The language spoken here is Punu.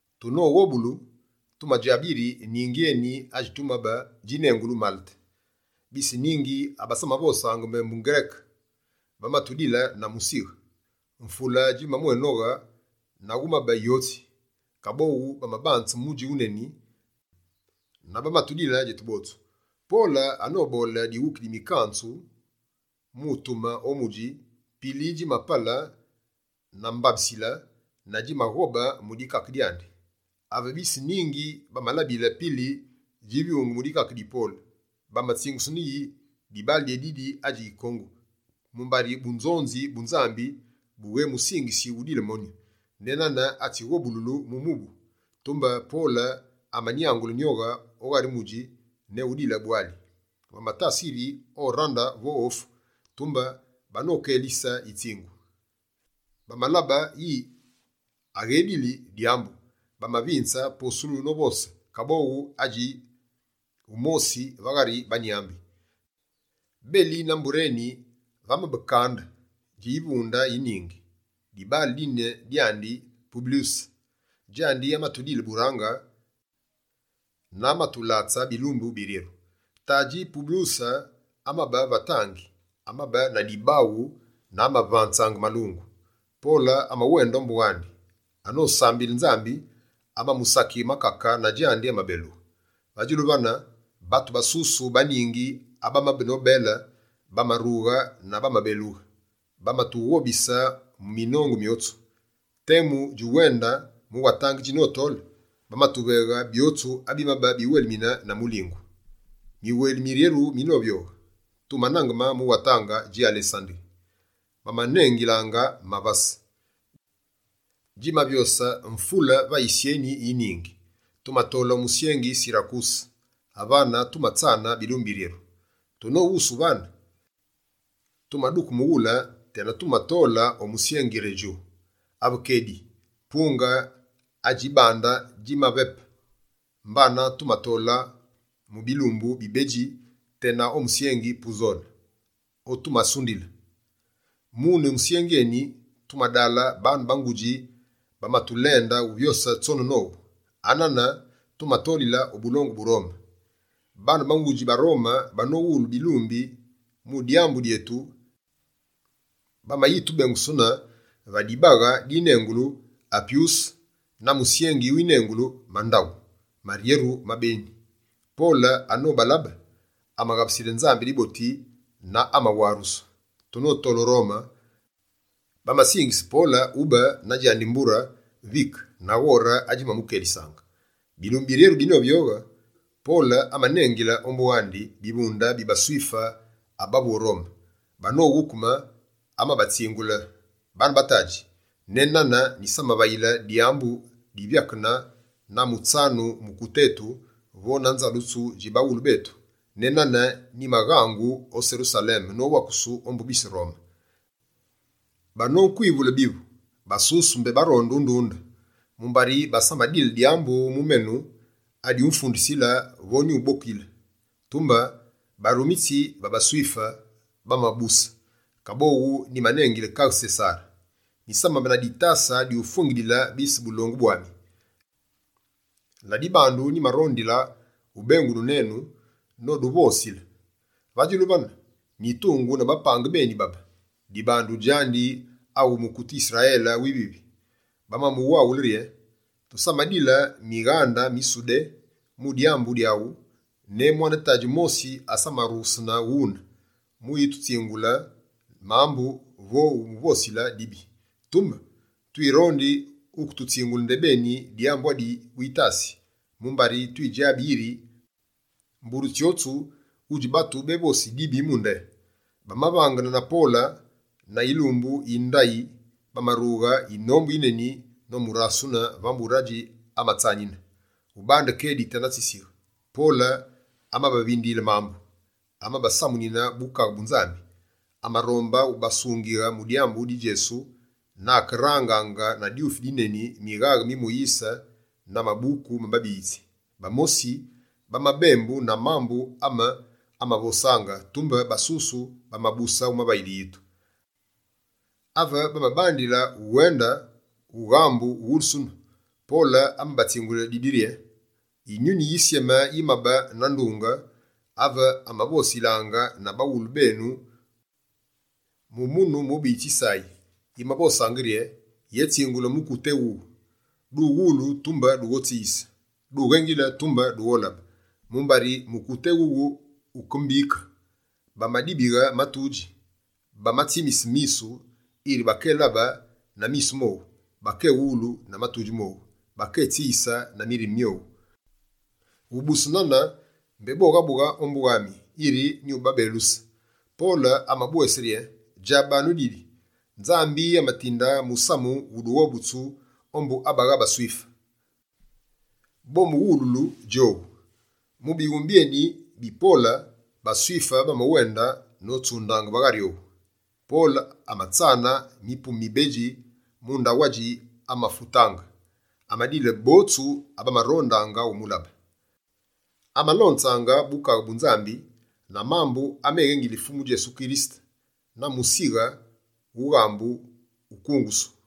Tunoghobulu, tumadjabe yiri ningi eni adjitumabe, djinengulu Malete. Bise ningi abasamavosaange mbembu Ngereke bamatudile na musighe. Mvule djimamwénoghe na wumabe yotsi, kaboghu bamabanze mudji wuneni na bamatudile djetu botsu. Pole anoboole dighuki di batsyenzu mu utume o mudji, pili djimapale na mbabisile na djimaghobe mu dikake dyandi. Ave bise ningi bamalabile pili djivyunge mu dikake di Pole, bamatsingusene yi: «Dibaale dyédidi adji yikongu, mumbari bunzonzi bu Nzambi bughémusingisi udile monyu, ne nana atsighobululu mu mubu.» Tumbe Pole amanyaghule nyoghe o ghari mudji, ne udile bwali. Bamatasa yiri orande vo ufu, tumbe banokélise yitsingu. Bamalabe yiri aghédili dyambu, bamavinze posulu novose, kaboghu adji wumosi va ghari banyambi. Beli na mbure eni vamabe kande dji yivunde yi ningi, dibaale dine dyandi Publyuse. Djandi amatudile burange na amatulatse bilumbu biryeru. Tadji Publyuse amabe va tangi, amabe na dibaghu na amavanze malungu. Pole amawende ombu wandi, anosambile Nzambi, amamusakighe makake na djandi amabelughe. Va djulu vane, batu basusu ba ningi abamabe nobele, bamarughe na bamabelughe. Bamatughobise mu minongu myotsu. Temu djuwende mu watange djinotole, bamatuveghe byotsu abimabe biwelimine na mulingu. Miweli miryeru minovyoghe, tumanaangeme mu watange dji Alesanderi, bamanengilaange «Mavase Mavase: nyambi bedji tsi mavase ma baNgereke.», djimavyose mvule va yisyeni yi ningi. Tumatole o musyengi Sirakuse, avane tumatsane bilumbu biryeru. Tunoghusughe vane, tumaduke mughule tena tumatole o musyengi Redjo. Ave kedi, punge adji bande dji mapepe, mbana tumatole mu bilumbu bibedji tena o musyengi Puzole otumasunduyile. Mune musyengi eni, tumadale baane ba ngudji, bamatulende uvyose tsone nowu. Anane tumatolile o bulongu bu Rome. Baane ba ngudji ba Rome banowulu bilumbi mu dyambu dyetu, bamayitubengusune va dibaghe dinengulu «Apyuse» na musyengi winengulu «Mandaghu Maryeru ma Beni». Pole anobalabe, amaghabusile Nzambi diboti na amawarusu. Tunotole o Rome, bamasingise Pole ube na djandi mbure vike, na ghore adjimamukelisaange. Bilumbu biryeru binovyoghe, Pole amanengile ombu wandi bivunde bi baSwife abavu o Rome. Banoghukeme, amabatsingule: «Bane batadji, ne nane nyisamavayile dyambu divyakene na mutsanu mukute etu vo na nzalusulu dji baghulu betu. Ne nane, nyimaghangu o Serusaleme, nowakusu ombu bise Rome. Banonkwivule byuvu, basusu mbé baronde undunde, mumbari basamadile dyambu mu menu adyumfundisile vo dyumbokile. Tumbe barumitsi ba baSwife bamabuse, kaboghu nyimanengile Kaghe Sesare. Nyisamabe na ditase dyufwengilili bise bulongu bwami. Ladibandu, nyimarondile ubengunu nenu no duvosile. Va djulu vane, nyitungu na bapange beni babe, dibandu djandi awu mukute Yisrayele wivivi.» Bamamuwawule rye: «Tusamadile mighande mi Sudé mu dyambu dyaghu, ne mwane tadji mosi asamarughesene ghune, mu ututsingule mambu vo mu uvosile dibi. Tumbe, twirondi wuketutsingule ndebeni dyambu adi witasi, mumbari twidjabi yiri mbure tsyotsu, wudji batu bévosi dibi mu nde.» Bamavangene na Pole, na yilumbu yi ndayi, bamarughe yinombu yineni nomurasune va mbure adji amatsanine. Ubande kedi tena tsisighe, Pole amabavindiyile mambu. Amabasamunine Bukaghe bu Nzambi, amarombe ubasungighe mu dyambu di Djesu, na akerangaange na dyufi dineni, mighaghe mi Moyise na mabuku ma Babiyitsi. Bamosi bamabembu na mambu ame amavosaange, tumbe basusu bamabuse umavayile yitu. Ave bamabandile uwende ughambu uwulusunu, Pole amabatsingule didi rye: «Yinyuni Yisyeme yimabe na ndunge, ave amavosilaange na baghulu benu mu munu mubiyitsi Yisayi! Yimavosaange rye: “Yétsingule mukute éwuwu: Duwulu, tumbe dughotsiyise. Dughengile, tumbe dugholabe. Mumbari mukute éwuwu wuke mbike. Bamadibighe matudji, bamatsimise misu, yiri bakélabe na misu mowu, bakéwulu na matudji mowu, bakétsiyise na mirime myowu. Ubuse nane, mbé boghabughe ombu wami, yiri nyubabeluse.”» Pole amabwese rye: «Djabanu didi Nzambi amatinde musamu wu dughobutsu ombu abagha baSwife. Bomuwululu djowu!» [ Mu bighume byeni bi Pole, baSwife bamawende notsundaange va ghari owu.] Pole amatsane mipume mibedji mu ndaghu adji amafutaange. Amadile botsu abamarondaange umulabe. Amalonzaange Bukaghe bu Nzambi na mambu ameghéngili Fumu Djesu Kirisete, na musighe wughambu ukungusu.